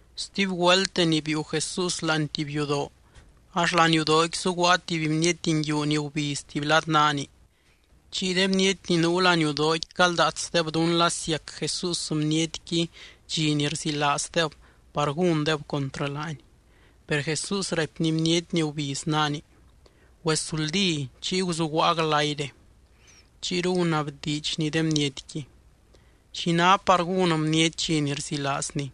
Stuby güelt deni biiu Jesús láani tuby yudoo, ax laniudooqui zuguaa tuby bniety nguiu ni gubiz tuby lad naani. Chiy de bniety ni nuu laniudooqui caldaatsdeb dún la siac Jesús bnietqui dxi ni rzilaazdeb par gúndeb contrɨ laany. Per Jesús raipny bniety ni gubiz naani: —Güesuldí chiy guzuguaa glayre. Chiyru gunabdiidxny de bnietqui: —¿Xi ná par gún bniety dxi ni rzilaazni?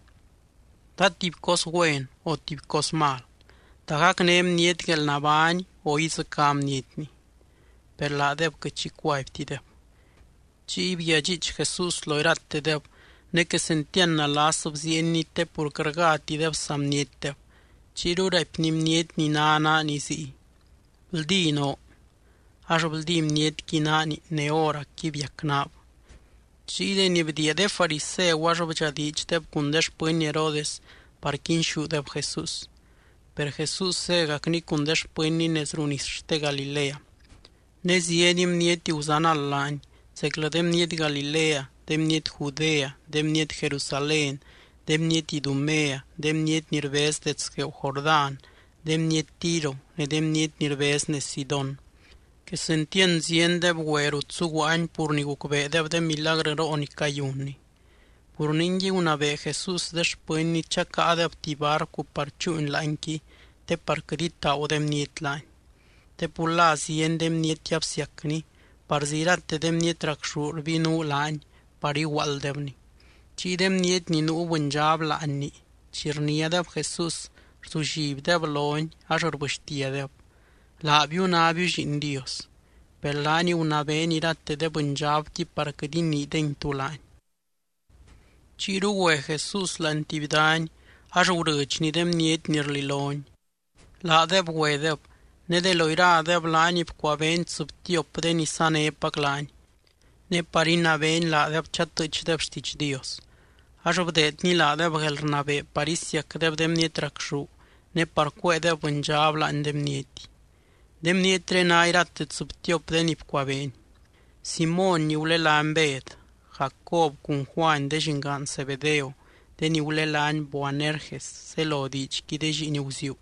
¿Ta tuby cos güen o tuby cos mal? ¿Ta gacné bniety guelnabány o idzɨcá bnietni? Per laadeb quɨt xi cuaibtideb. Chiy bguiadxiich Jesús lo iratedeb ne quesentiand nalas bziienny te pur quɨt rgátideb saa bnietdeb. Chiyru raipny bniety ni ná naani ziy: —Bldí noo. Ax bldí bnietqui naani ne hóracqui biac naab. Chiy deni bdiia de fariseu ax bdxadiidxdeb cun de xpɨny Herodes par quinxúdeb Jesús. Per Jesús zégacny cun de xpɨnny nez ruu nis xte Galilea. Ne zieny bniety guzanald laany, zeclɨ de bniety Galilea, de bniety Judea, de bniety Jerusalén, de bniety Idumea, de bniety ni rbez dets gueeu Jordán, de bniety Tiro, ne de bniety ni rbez nez Sidón. Quesentiand ziendeb güe rut zuguaany pur ni gucbeedeb de milagrɨroo ni cayunny. Pur ningui, gunabee Jesús de xpɨnny chacáadeb tuby barcu par chúuny láanqui te par quɨt itaagu de bniety laany. Te pur la zieny de bniety absiacny. Parzi irate de bniety racxú rbinuu laany par iguaalddebny. Chiy de bniety ni nuu bɨndxab láanni chi rniádeb Jesús, rzullibdeb lony. Ax rbɨxtiadeb: —¡Laabiu nábiu Lliin Dios! Per laany gunabeeny irate de bɨndxabqui par quɨt iniidengui tú laany. Chiyru güe Jesús láani tuby dany ax gurɨdxny de bniety ni rlilony. Laadeb güedeb, ne de lo iradeb laany bcuabeeny tsɨbtiop de ni sanépac laany, ne par inabeeny laadeb chatɨɨchdeb xtiidx Dios. Ax bdeedny laadeb guelrnabee par isiacdeb de bniety racxú ne par cuéedeb bɨndxab láani de bniety. De bnietré ná irate tsɨbtiop de ni bcuabeeny: Simóny ni gulelány Bed, Jacob cun Juany de llingaan Zebedeo de ni gulelány Boanerges zelo diidxqui de lliin guziuu.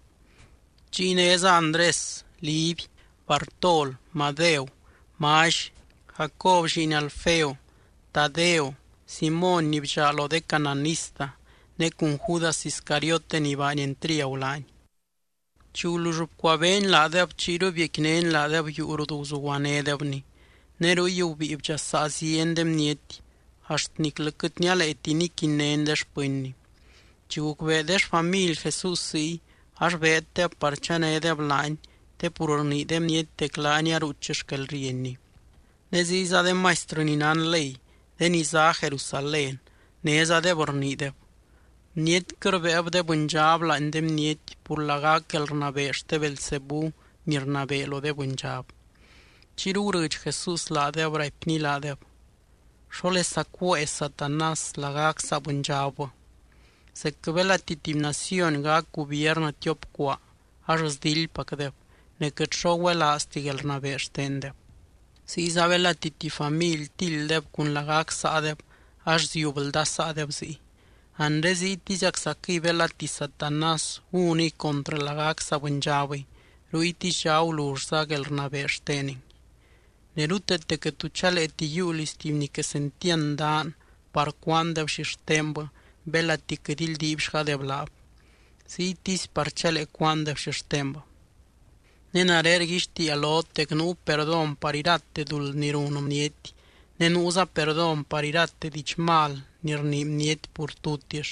Chiy néza Andrés, Liby, Bartol, Madeu, Mally, Jacob lliin Alfeo, Tadeo, Simóny ni bdxaa lo de cananista, ne cun Judas Iscariote ni baany entriagu laany. Chi gulull bcuabeeny laadeb chiyru biecquinény laadeb yuu rut guzuguanédebny. Ne ruy gubíi bdxasaa zieny de bniety, axt niclɨ quɨt nialeeti niquinnény de xpɨnny. Chi gucbee de xfamily Jesús ziy, ax beeddeb par chanédeb laany te pur rnii de bniety dec laany aruuch xquelrienny. Ne ziyza de maistrɨ ni nán ley de ni zá Jerusalén nézadeb rniideb: —Bnietquɨ rbéeb de bɨndxab láani de bniety pur lagac guelrnabee xte Beelzebú ni rnabee lo de bɨndxab. Chiyru gurɨdx Jesús laadeb, raipny laadeb: —¿Xólesa cuée Satanás lagac saa bɨndxabbɨ? Zecquɨ belati tuby naciony gac gubiernɨ tiop cuaa, ax sdildpacdeb ne quɨt xo güelaazti guelrnabee xtendeb. Ziyza belati tuby family tilddeb cun lagac saadeb, ax ziub ldasaadeb ziy. Anre ziytiziaczaquɨy belati Satanás gúniy contrɨ lagac saa bɨndxabɨy, ruytisdxa agulullza guelrnabee xteningui. ’Ne ruteete quɨt tu chaleeti yiiu liz tuby ni quesentiand daan par cúaandeb xixtenbɨ belati quɨt ildiibxgadeb laab. Ziytisy par chalee cúaandeb xixtenbɨ. ’Ne nare rguixtiia lot dec nuu perdón par irate duld ni run bniety, ne nuuza perdón par irate diidx mal ni rnii bniety pur tutix.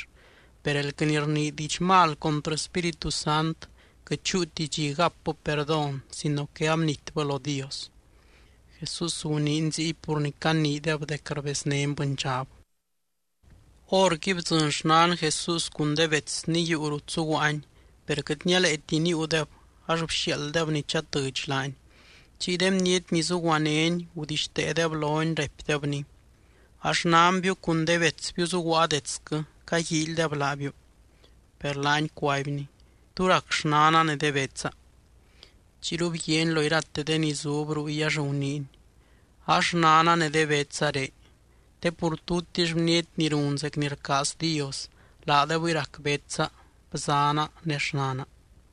Per elquɨ ni rnii diidx mal contrɨ Spíritu Sant, quɨt chúuti dxi gapbɨ perdón sino que abnitbɨ lo Dios. Jesús guniiny ziy pur ni caniideb dec rbeznény bɨndxab. Horqui bdzɨny xnan Jesús cun de betsny yuu rut zuguaany, per quɨt nialeeti níiudeb ax bxiaalddeb ni chatɨdx laany. Chiy de bniety ni zuguanény gudixteedeb lony, raipdebny: —A xnanbiu cun de betsbiu zuguaa detsquɨ caguíilydeb laabiu. Per laany cuaibny: —¿Tú rac xnana ne de betsa? Chiyru bguiaany lo irate de ni zub ruy ax guniiny: —A xnana ne de betsa ré, te pur tutix bniety ni run zec ni rcaaz Dios, laadebɨy rac betsa, bzaana ne xnana.